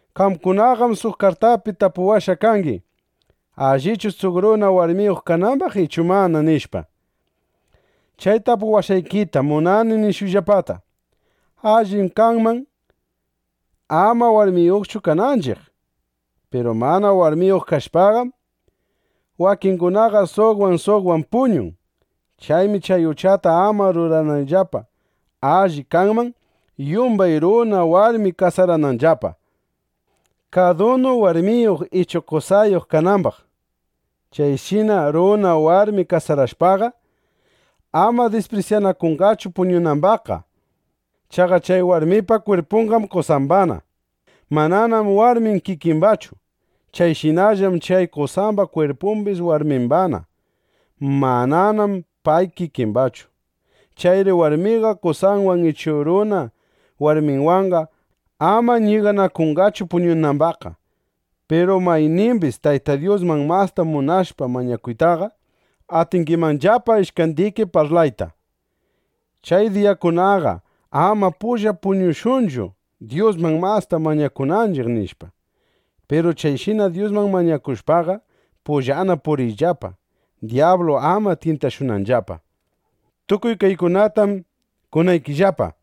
Qamkunaqam suq kartapi tapuwashqa kangi: “¿Allichu suq runa warmiyuq kanambaq ichu mana?” nishpa. Chay tapuwashqaykita munani nishuyllapata. Allim kanman ama warmiyuqchu kananchiq. Piru mana warmiyuq kashpaqam, wakingunaqa suqwan suqwan puñun. Chaymi chay uchata ama rurananllapa, alli kanman, yumbay runa, warmi kasarananllapa, kadunu warmiyuq ichu qosayuq kanambaq. Chayshina runa warmi kasarashpaqa, ama disprisyanakunqachu puñunambaqqa. Chaqa chay warmipa kwirpunqam qosambana. Mananam warmin kikimbachu. Chayshinallam chay qosamba kwirpumbis warmimbana. Mananam pay kikimbachu. Chayri warmiqa qosanwan ichu runa warminwanqa ama ñiganakunqachu puñunambaqqa. Piru maynimbis Tayta Dyusman masta munashpa mañakuytaqa, atingimanllapa ishkandiki parlayta: “Chay diyakunaqa ama pulla puñushunchu, Dyusman masta mañakunanchiq”, nishpa. Piru chayshina Dyusman mañakushpaqa, pullana puñuriyllapa, dyablu ama tyintashunanllapa. Tukuy kaykunatam kunaykillapa,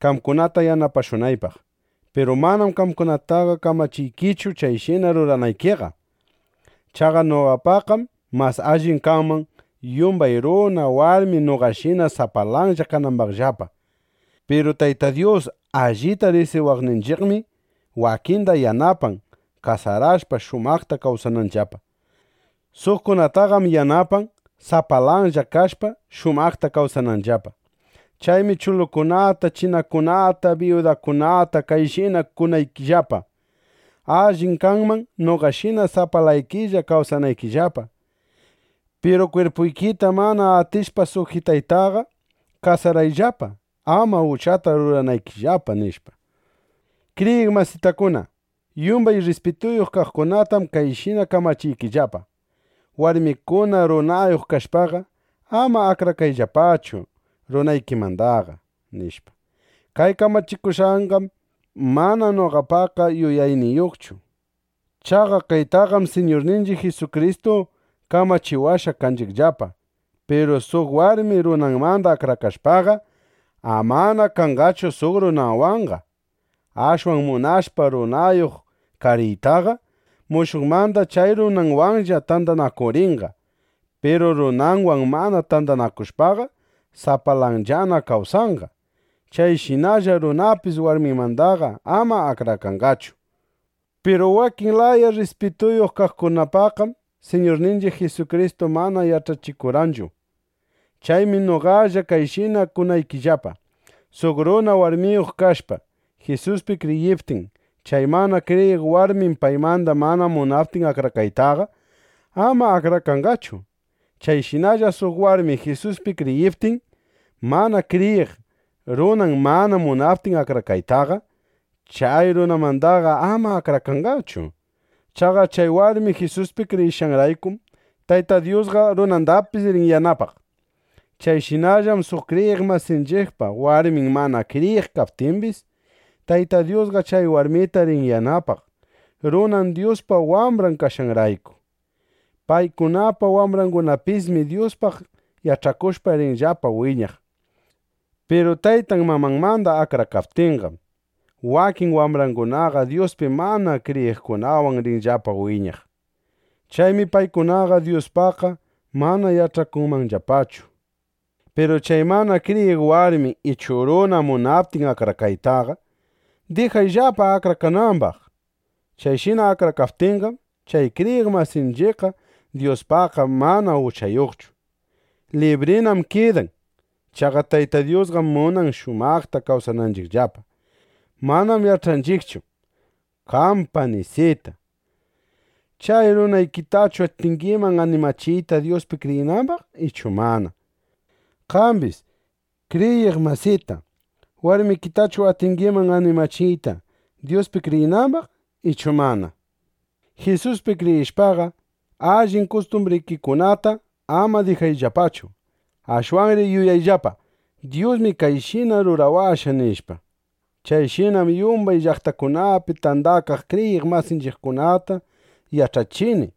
qamkunata yanapashunaypaq. Piru manam qamkunataqa kamachiykichu, chayshina ruranaykiqa. Chaqa noqapaqqam mas alli kanman, yumbay runa, warmi noqashina sapalanlla kanambaqllapa. Piru Tayta Dyus allita riqsiwaqninchiqmi, wakinda yanapan, kasarashpa, shumaqta kawsananllapa. Suqkunataqam yanapan, sapalanlla kashpa, shumaqta kawsananllapa. Chaymi chulukunata, chinakunata, biyudakunata kayshina kunaykillapa: Allim kanman noqashina sapalaykilla kawsanaykillapa. Piru kwirpuykita mana atishpa sujitaytaqa, kasarayllapa, ama uchata ruranaykillapa, nishpa. Kriyiq masitakuna, yumbay rrispituyuq kaqkunatam kayshina kamachiykillapa: Warmikuna runayuq kashpaqa, ama akrakayllapachu runaykimandaqa, nishpa. Kay kamachishushqayqam mana noqapa yuyayniychu. Chaqa kaytaqam Siñurninchiq Jisukristu kamachiwashqa kanchiqllapa. Piru suq warmi runanmanda akrakashpaqa, amana kanqachu suq runawanqa. Ashwan munashpa runayuq kariytaqa, mushuqmanda chay runanwanlla tandanakurinqa. Piru runanwan mana tandanakushpaqa, sapalanllana kawsanqa. Chayshinalla runapis warminmandaqa ama akrakanqachu. Piru wakin laya rrispituyuq kaqkunapaqqam Siñurninchiq Jisukristu mana yach'achikurqanchu. Chaymi noqalla kayshina kunaykillapa: Suq runa warmiyuq kashpa, Jisuspi kriyiptin, chay mana kriyiq warmin paymanda mana munaptin akrakaytaqa, ama akrakanqachu. Chayshinalla suq warmi Jisuspi kriyiptin, mana kriyiq runan mana munaptin akrakaytaqa, chay runanmandaqa ama akrakanqachu. Chaqa chay warmi Jisuspi kriyishqanraykum, Tayta Dyusqa runandapis rin yanapaq. Chayshinallam suq kriyiq masinchiqpa warmin mana kriyiq kaptimbis, Tayta Dyusqa chay warmita rin yanapaq, runan Dyuspa wambran kashqanrayku. Paykunapa wambrangunapismi Dyuspaq yach'akushpa rinllapa wiñaq. Piru taytan mamanmanda akrakaptinqam, wakin wambrangunaqa Dyuspi mana kriyiqkunawan rinllapa wiñaq. Chaymi paykunaqa Dyuspaqqa mana yach'akunmanllapachu. Piru chay mana kriyiq warmi ichu runa munaptin akrakaytaqa, dijayllapa akrakanambaq. Chayshina akrakaptinqam, chay kriyiq masinchiqqa Dyuspaqqa mana uchayuqchu. Librinam kidan. Chaqa Tayta Dyusqam munan, shumaqta kawsananchiqllapa. Manam yach'anchiqchu: Qam panisita, ¿chay runaykitachu atingiman animachiyta, Dyuspi kriyinambaq ichu mana? Qambis, kriyiq masita, ¿warmikitachu atingiman animachiyta, Dyuspi kriyinambaq ichu mana? nishpa. Jisuspi kriyishpaqa, allin kustumbrikikunata ama dijayllapachu. Ashwanri yuyayllapa: Dyusmi kayshina rurawashqa, nishpa. Chayshinam yumbay llaqtakunapi tandakaq kriyiq masinchiqkunata yach'achini.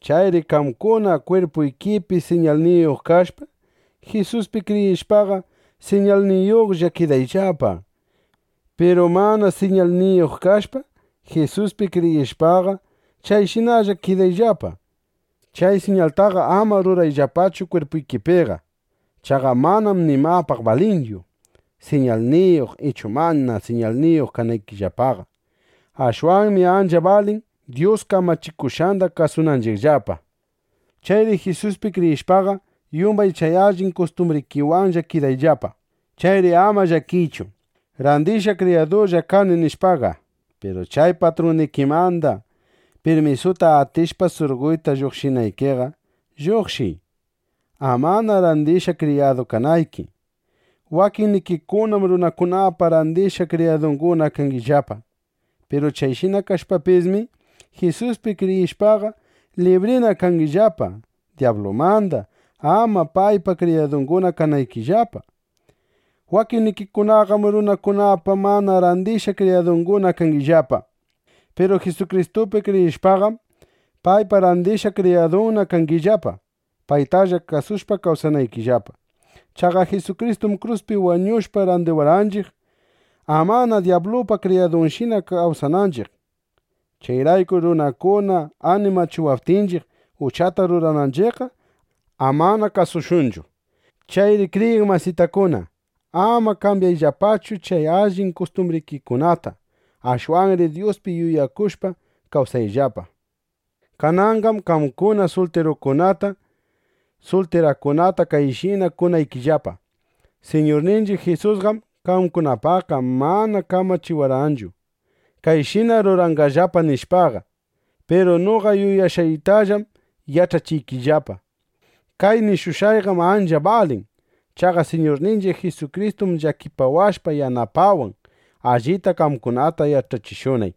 Chayri qamkuna kwirpuykipi siñalniyuq kashpa, Jisuspi kriyishpaqa, siñalniyuqlla kidayllapa. Piru mana siñalniyuq kashpa, Jisuspi kriyishpaqa, chayshinalla kidayllapa. Chay siñaltaqa ama rurayllapachu kwirpuykipiqa. Chaqa manam nimapaq balinchu, siñalniyuq ichu mana siñalniyuq kananchiqllapaqa. Ashwanmi ancha balin Dyus kamachikushqanda kasunanchiqllapa. Chayri Jisuspi kriyishpaqa, yumbay chay allin kustumbrikiwanlla kidayllapa. Chayri ama llakiychu: Randishqa kriyadulla kani, nishpaqa. Piru chay patrunnikimanda pirmisuta atishpa surqoyta lluqshinaykiqa, lluqshiy, amana randishqa kriyadu kanayki. Wakinnikikunam runakunapa randishqa kriyadunguna kangillapa. Piru chayshina kashpapismi, Jisuspi kriyishpaqa, librina kangillapa dyablumanda, amana paypa kriyadunguna kanaykillapa. Wakinnikikunaqam runakunapa mana randishqa kriyadunguna kangillapa. Piru Jisukristupi kriyishpaqam, paypa randishqa kriyadunna kangillapa, paytalla kasushpa kawsanaykillapa. Chaqa Jisukristum kruspi wañushpa, randiwarqanchiq, amana dyablupa kriyadunshina kawsananchiq. Chayraykur runakuna animachiwaptinchiq, uchata rurananchiqqa, amana kasushunchu. Chayri kriyiq masitakuna, ama kambyayllapachu chay allin kustumbrikikunata. Ashwanri Dyuspi yuyakushpa kawsayllapa. Kananqam qamkuna sultirukunata, sultirakunata kayshina kunaykillapa: Siñurninchiq Jisusqam qamkunapaqqa mana kamachiwarqanchu: Kayshina ruranqallapa, nishpaqa. Piru noqa yuyashqaytallam yach'achiykillapa. Kay nishushqayqam ancha balin. Chaqa Siñurninchiq Jisukristum llakipawashpa yanapawan, allita qamkunata yach'achishunay.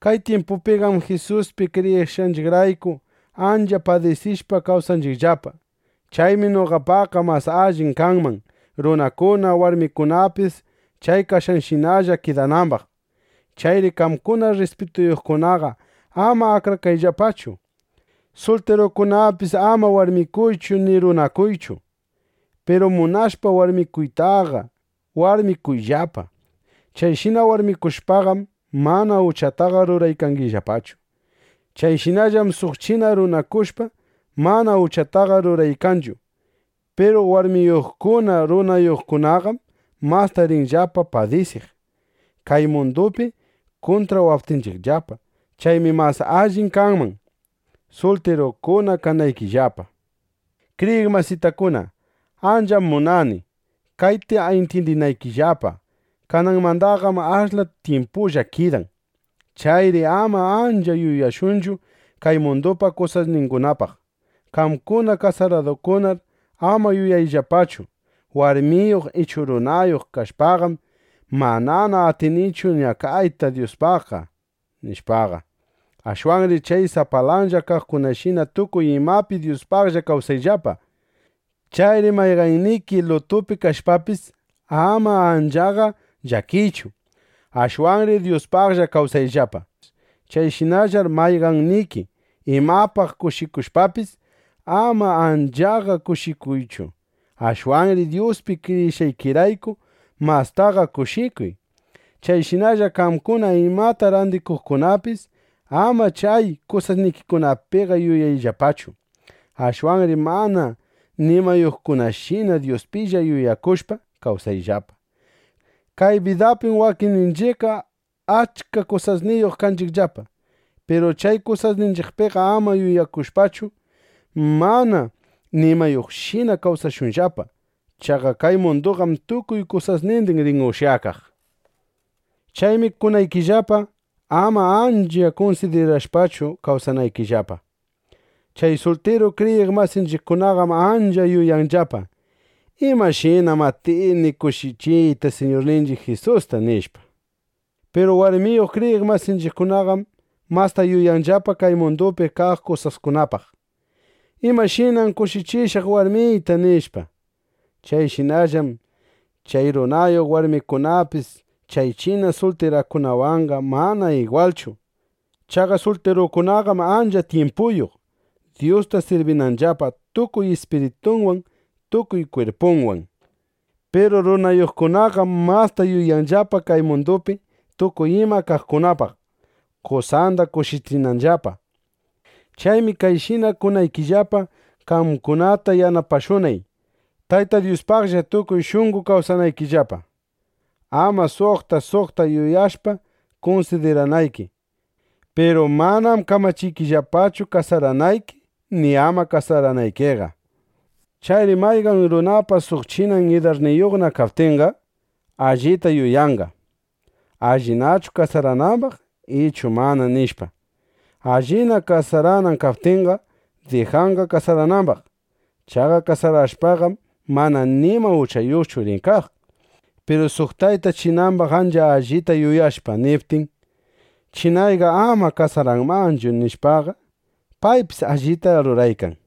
Kay tyimpupiqam Jisuspi kriyishqanchiqrayku, ancha padisishpa kawsaykanchiqllapa. Chaymi noqapaqqa mas alli kanman, runakuna, warmikunapis chay kashqanshinalla kidanambaq. Chayri qamkuna rrispituyuqkunaqa ama akrakayllapachu. Sultirukunapis ama warmikuychu ni runakuychu. Piru munashpa warmikuytaqa, warmikuyllapa. Chayshina warmikushpaqam, mana uchataqa ruraykangillapachu. Chayshinallam suq china runakushpa, mana uchataqa ruraykanchu. Piru warmiyuqkuna, runayuqkunaqam masta rinllapa padisiq, kay mundupi kuntrawaptinchiqllapa. Chaymi mas alli kanman, sultirukuna kanaykillapa. Kriyiq masitakuna, ancham munani, kayta intyindinaykillapa: Kananmandaqam ashla tyimpullana kidan. Chayri ama ancha yuyashunchu kay mundupa kusasningunapaq. Qamkuna kasaradukunar ama yuyayllapachu: Warmiyuq ichu runayuq kashpaqam, manana atinichu ñakayta Dyuspaqqa, nishpaqa. Ashwanri chay sapalanlla kaqkunashina tukuy imapi Dyuspaqlla kawsayllapa. Chayri mayqanniki lutupi kashpapis, ama anchaqa llakiychu. (Ashwanri Dyuspaqlla kawsayllapa.) Chayshinallar mayqanniki imapaq kushikushpapis, ama anchaqa kushikuychu. (Ashwanri Dyuspi kriyishqaykirayku mastaqa kushikuy.) Chayshinalla qamkuna imata randiqkunapis ama chay kusasnikikunapiqa yuyayllapachu. (Ashwanri mana nimayuqkunashina Dyuspilla yuyakushpa, kawsayllapa.) Kay bidapim wakinninchiqqa achka kusasniyuq kanchiqllapa. Piru chay kusasninchiqpiqa ama yuyakushpachu, mana nimayuqshina kawsashunllapa. Chaqa kay munduqam tukuy kusasnindin rin ushyakaq. Chaymi kunaykillapa, ama ancha kunsidirashpachu kawsanaykillapa. Chay sultiru kriyiq masinchiqkunaqam ancha yuyanllapa: ¿Imashinam atini kushichiyta Siñurninchiq Jisusta? nishpa. Piru warmiyuq kriyiq masinchiqkunaqam masta yuyanllapa kay mundupi kaq kusaskunapaq: ¿Imashinam kushichishaq warmiyta? nishpa. Chayshinallam chay runayuq warmikunapis chay china sultirakunawanqa mana igwalchu. Chaqa sultirakunaqam ancha tyimpuyuq, Dyusta sirbinanllapa tukuy ispiritunwan tukuy kwirpunwan. Piru runayuqkunaqam masta yuyanllapa kay mundupi tukuy ima kaqkunapaq, qosanda kushichinanllapa. Chaymi kayshina kunaykillapa, qamkunata yanapashunay, Tayta Dyuspaqlla tukuy shunqo kawsanaykillapa, ama suqta suqta yuyashpa, kunsidiranayki. Piru manam kamachiykillapachu kasaranayki ni ama kasaranaykiqa. Chayri mayqan runapa suq chinan idarniyuqna kaptinqa, allita yuyanqa: Allinachu kasaranambaq ichu mana, nishpa. Allina kasaranan kaptinqa, dijanqa kasaranambaq. Chaqa kasarashpaqam, mana nima uchayuqchu rin kaq. Piru suq tayta chinambaq ancha allita yuyashpa, niptin: “Chinayqa ama kasaranmanchu”, nishpaqa, paypis allita ruraykan.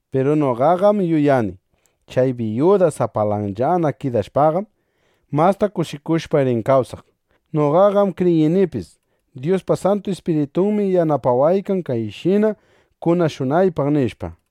Piru noqaqam yuyani: Chay biyuda sapalanllana kidashpaqam, masta kushikushpa rin kawsaq. Noqaqam kriyinipis: Dyuspa Santu Ispiritunmi yanapawaykan, kayshina kunashunaypaq, nishpa.